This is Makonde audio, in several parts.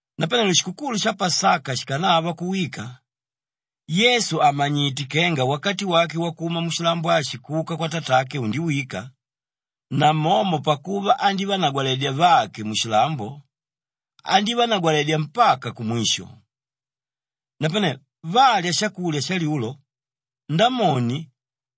Napanelo shikukulu sha Pasaka shikanava kuwika, Yesu àmanyite kenga wakati wake wakuma mushilambo ashi kuka kwatatake undiwika, namomo pakuva andívanagwaledya vake mushilambo, andívanagwaledya mpaka kumwisho. Napane valya shakulya shalyulo, Ndamoni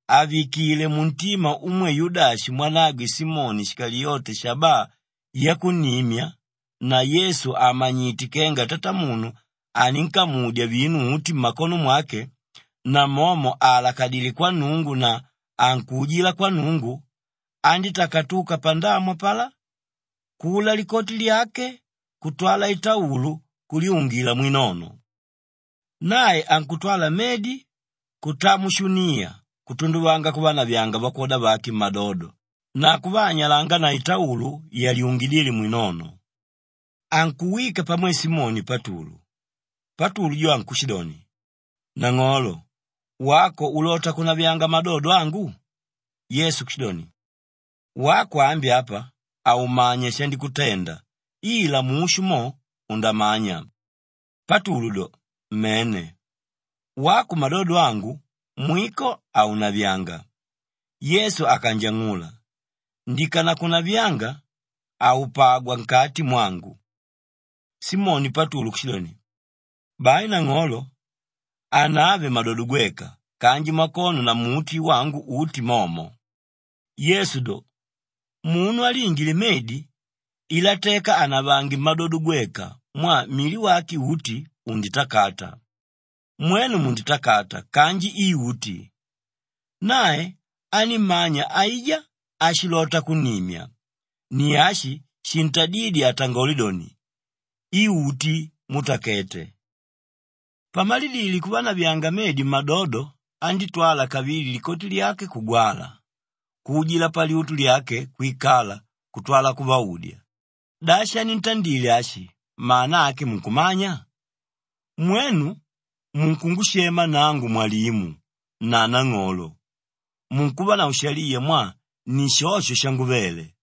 àvikile muntima umwe Yudashi mwanagwe Simoni Shikaliyote shabaa yakunnimya na Yesu àmanyite kenga Tatamunu aninkamudya vinu uti mmakono mwake, namomo àalakadile kwa Nnungu na ankuujila kwa Nnungu, andítakatuka pandamu apalá, kula likoti lyake kutwala itaulu kulyungila mwinono. Nae ankutwala medi kutaa mushuniya kutunduvanga kuvanavyanga vakwoda vake mmadodo na kuvaanyalanga na itaulu yalyungidíle mwinono. Ankuwika pamwe Simoni Patulu, Patulu jo ankushidoni, “Nang'olo, wako ulota kunavyanga madodo angu?” Yesu kushidoni, “Wako ambi apa haumanya shandikutenda ila mushu mo, undamanya.” Patulu do, “Mene. Wako madodo angu, mwiko haunavyanga!” Yesu akanjang'ula, “Ndikanakunavyanga, haupagwa nkati mwangu.” Simoni Patulu kushidoni, “Bai nang'olo, hanave madodo gweka kanji makono na muti wangu uti momo.” Yesu do, “Munu áliingile medi, iloteka anavange mmadodo gweka mwaa mili wake uti unditakata. Mwenu munditakata kanji i uti.” Nae anímmanya aijá áshilota kunnimya; ni ashi shintadídye atangole doni, “I uti mútakete.” Pamalidile kuvanavyanga medi mmadodo, andítwala kavili likoti lyake kugwala, kuujila palyutu lyake kwikala kutwala kuvaudya, “Da shanintandile ashi, mana ake munkumanya? Mwenu munkungushema nangu Mwalimu na Nang'olo, munkuvanavo shaliya mwaa ni shosho shanguvele.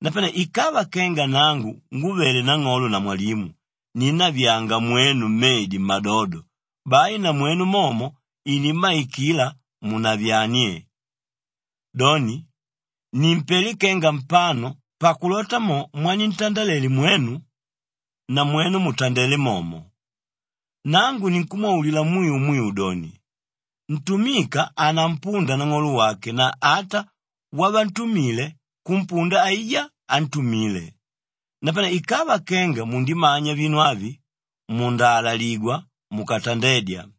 Napane ikava kenga nangu ngúvele Nang'olo na Mwalimu ninnavyanga mwenu medi mmadodo, bai namwenu momo inimmaikila munavyanie. Doni, nimpelé kenga mpano pakulota mo mwanintandalele mwenu, namwenu mutandele momo. Nangu ninkumwaulila mwiu mwiu doni, ntumika hanampunda nang'olo wake na ata wavantumile kumpunda aijá ántumile. Napane ikava kenga mundimanya vinu avi, mundaalaligwa mukatandedya.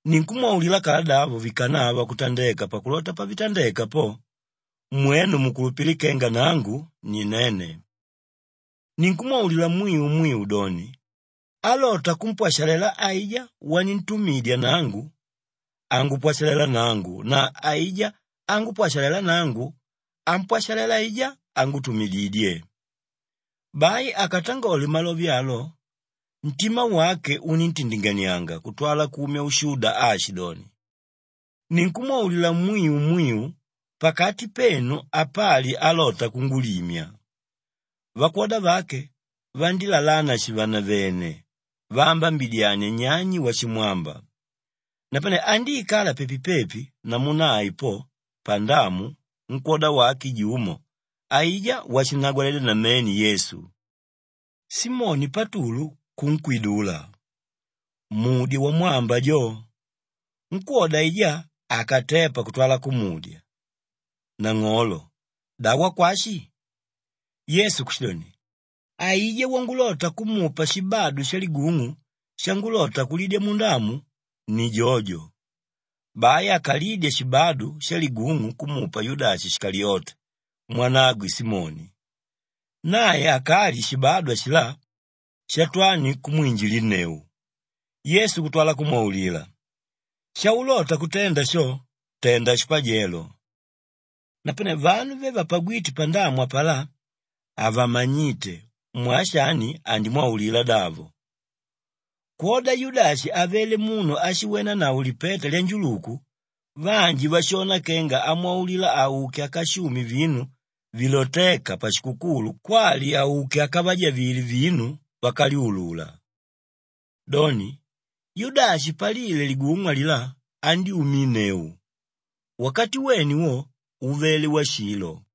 Ninkumwaulila kaladavo vikanava kutandeka pakulota pavitandeka po, mwenu mukulupile kenga Nangu ni Nene. Ninkumwaulila mwiu mwiu doni, álota kumpwashalela aijá wanintumidya nangu, angupwashalela nangu na aijá ángupwashalela nangu, ampwashalela aijá ángutumididye.” Bai akatangole malove alo, ntima wake uníntindinganianga kutwala kumya ushuda aashidoni, “Ninkumwaulila mwiu mwiu, pakati penu apali álota kungulimya.” Vakwoda vake vandílalana shivenevene vaambabidyania nyani washimwamba. Napane andíikala pepi-pepi namu nae po pandamu nkwóda wake jumo aijá washinnagwaledya namene Yesu. Simoni Patulu kunkwidula, “Mudye wamwamba jo.” Nkwóda aijá akatepa kutwala kumudya, “Nang'olo, da wakwashi?” Yesu kushidoni, “Aijá wangulota kumupa shibadu shaligung'u shangulota kulidya mundamu, ni jojo.” Bai akalidya shibadu shaligung'u kumupa Yudashi Shikaliyote mwanagwe Simoni. Nae akalye shibadu ashilá, Shatwani kumwinjilinneu. Yesu kutwala kumwaulila, “Shaulota kutenda sho, tenda shipajelo.” Napane vanu ve vapagwíte pandamu apalá havamanyíte mwaa shani andímwaulila davo. Kwoda Yudashi avele munu áshiwenanavo lipeta lyanjuluku, vanji vashona kenga amwaulila auke akashume vinu vilotéka pashikukulu kwali auke akavajavile vinu vákalyulula. Doni, Yudashi palile ligung'u alilá andyúminneu. Wakati wene wo, uvele washilo.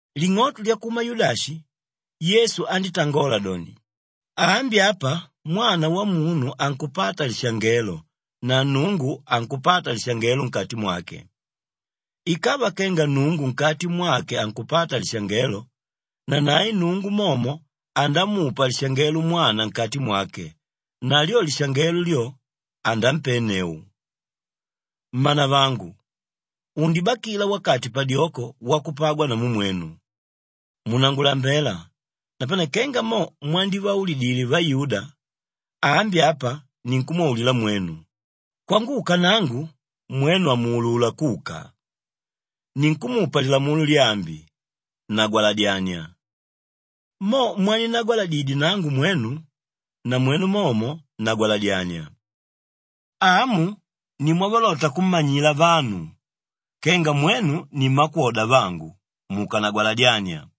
Ling'oto lyakuma Yudashi, Yesu andítangola doni, “Ambi apa Mwana Wamunu ankupata lishangelo na Nnungu ankupata lishangelo nkati mwake. Ikava kenga Nnungu nkati mwake ankupata lishangelo, nanae Nnungu momo andamupa lishangelo Mwana nkati mwake na lyo lishangelo lyo, anampenneu. “Mmanavangu, undibakila wakati padyoko wakupagwa namu mwenu. Munangulambela napane kenga mo mwandivaulidile vayuda, ambi apa ninkumwaulila mwenu, ‘Kwanguka nangu mwenu hamuulula kuka.’ Ninkumupa lilamulo lyaambi; nagwaladyania. Mo mwaninnagwaladidye nangu mwenu, namwenu momo nagwaladyania. Amu ni mwavalota kummanyila vanu kenga mwenu ni mmakwoda vangu, mukanagwaladyania.”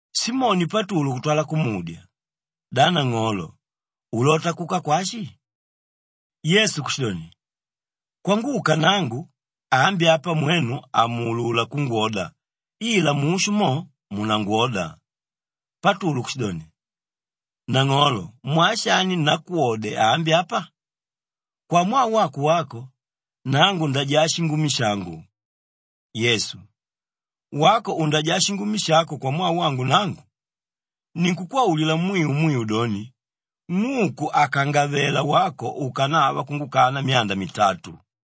Simoni Patulu kutwala kumudya, “Da Nang'olo, ulota kuka kwashi?” Yesu kushidoni, “Kwanguka nangu, ambi apa mwenu hamuulula kungwoda ila mushu mo, munangwoda.” Patulu kushidoni, “Nang'olo mwaa shani nakwode ambi apa? Kwamwaa wako wako, nangu ndajaa shingumi shangu.” Yesu, “Wako undajaa shingumi shako kwamwaa wangu nangu? Ninkukwaulila mwiu mwiu doni, ng'uku hakangavela wako ukanava kungukana myanda mitatu.